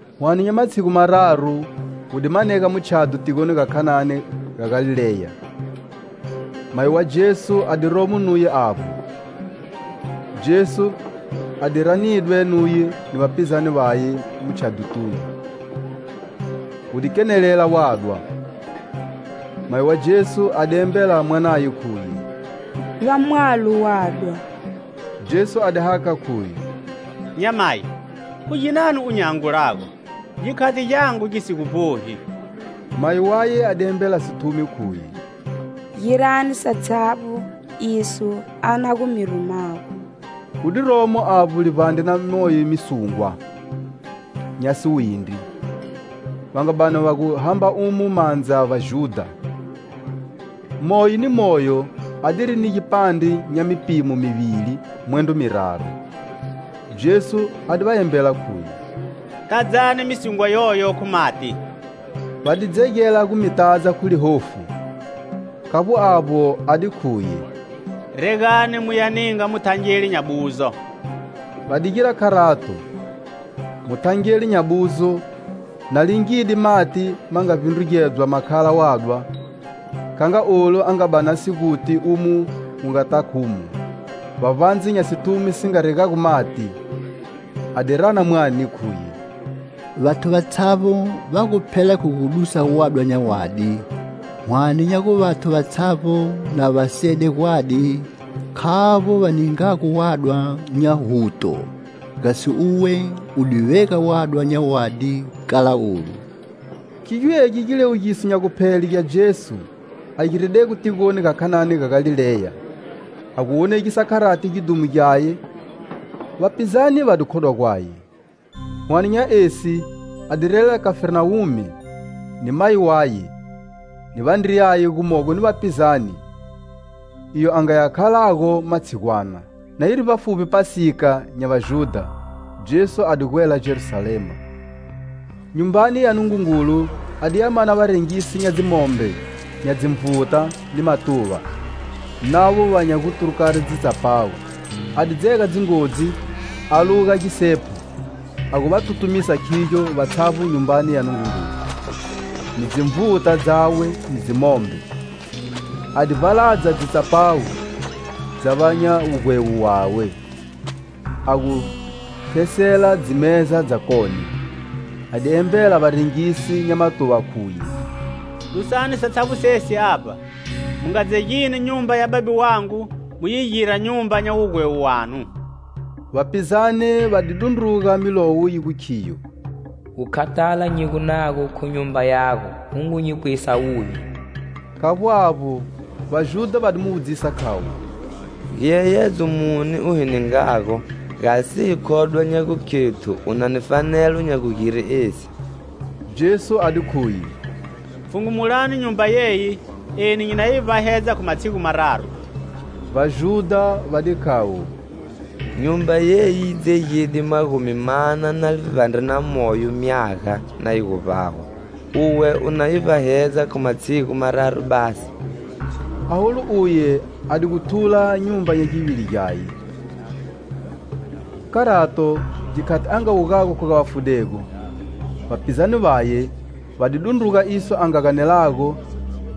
Whane nya matshigu mararu, wu di manega mutshadho tigoni ga Khanani ga Galileya. Mayi wa Jesu a di romo nuye avbo. Jesu a di ranidwe nuye ni vapizane vaye mutshadhotunu. Gu di kenelela wadwa. Mayi wa Jesu a di embela mwanaye, khuye: "Va mwalo wadwa." Jesu a di hakha, khuye: "Nyamayi! Khu ginani u nyi angulago? Gikhati Gyangu gi si gu vbohi." Mayi waye a di embela sithumi, khuye: "Girani satshavbo iso a na gu mi rumago." Gu di romo avbo livbandre na moyo misungwa nya siwindri, va nga bani va gu hamba umo mandza Vajudha; moyo ni moyo adiri ni gipandre nya mipimo mivili mwendro miraru. Jesu a di va embela, khuye: "Tadzani misungwa yoyo khu mati." Va di dzegela gu mi tadza khu lihofu. Khavbo avbo, a di khuye: "Regani muya ninga muthangeli nya buzo." Va di gira kharato. Muthangeli nya buzo, na lingide mati ma nga vbindrugedzwa ma khala wadwa, kha nga olu a nga bani a si guti umo wu nga ta khumo, vbavbandze nya sithumi si nga regago mati, a di rana mwane, khuye: "Vathu vatshavbo va gu phela khu gu dusa wadwa nya wadi, hwane nya gu vathu vatshavbo, na va sede gwadi, khavbo va ningago wadwa nya huto. Gasi uwe u di vega wadwa nya wadi kala olu!" Khigyo egi giliwugiso nya guphele gya Jesu a giredego tigoni ga Khanani ga Galileya a gu wonegisa kharati gidhumo gyaye; vapizane va di khodwa gwaye. Hwane nya esi, a di relela Khafarnawume ni mayi waye, ni vandriyaye, gumogo ni vapizane, iyo a ngaya khalago matshigwana. Na yiri vbafuvbi Phasika nya Vajudha, Jesu a di gwela Jerusalema, Nyumbani ya Nungungulu a diya mana varengisi nya dzimombe, nya dzinvuta ni matuva, navo vanya gu turukari dzitsapawu. A di dzega dzingodzi a luga gisephu, a gu va tutumisa khigyo vatshavbo Nyumbani ya Nungungulu, ni dzinvuta dzawe ni dzimombe. A di vbaladza dzitsapawu dza va nya wugwewo wawe, a gu thesela dzimeza dzakone. A di embela varengisi nya matuva, khuye: "Dusani satshavbo sesi avba. Mu nga dzegini nyumba ya Babe wangu mu yi gira nyumba nya wugwewo wanu." Vapizane va di dundruga milowo yi gu khiyo: "Gukhathala nyi gu nago khu nyumba yago gu ngu nyi pwisa wuvi." Khavbo avbo, Vajudha va di mu wudzisa khayo: "Giyeyedzo muni u hi ningago gasi hi khodwe nya gukhethu u na ni fanelo nya gugire esi?" Jesu a di khuye: "Pfhungumulani Nyumba yeyi eni nyi na yi vbahedza khu matshigu mararu." Vajudha va di khavo: "Nyumba yeyi yi dzegide magumi mana na livbandre na moyo myaga na yi gu vbahwa uwe u na yi vbahedza khu matshigu mararu basi?" Aholu uye a di gu thula nyumba nya givili gyaye. Khu kharato, gikhati a nga wugago khu ga vafudego, vapizane vaye va di dundruga iso a nga ganelago,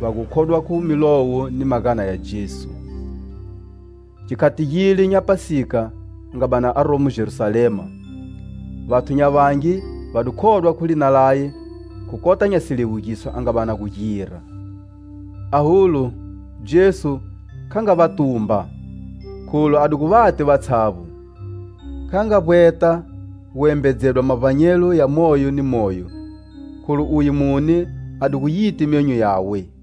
va gu khodwa khu Milowo ni magana ya Jesu. Gikhati gile nya Phasika a nga bani aromo Jerusalema, vathu nya vangi va di khodwa khu lina laye khu kota nya siliwugiso a nga bani a gu gira. Aholu, Jesu kha nga va tumba, kholu a di gu va ti vatshavbo. Kha nga vbweta guembedzedwa mavbanyelo ya moyo ni moyo, kholu uye mune a di gu yiti myonyo yawe.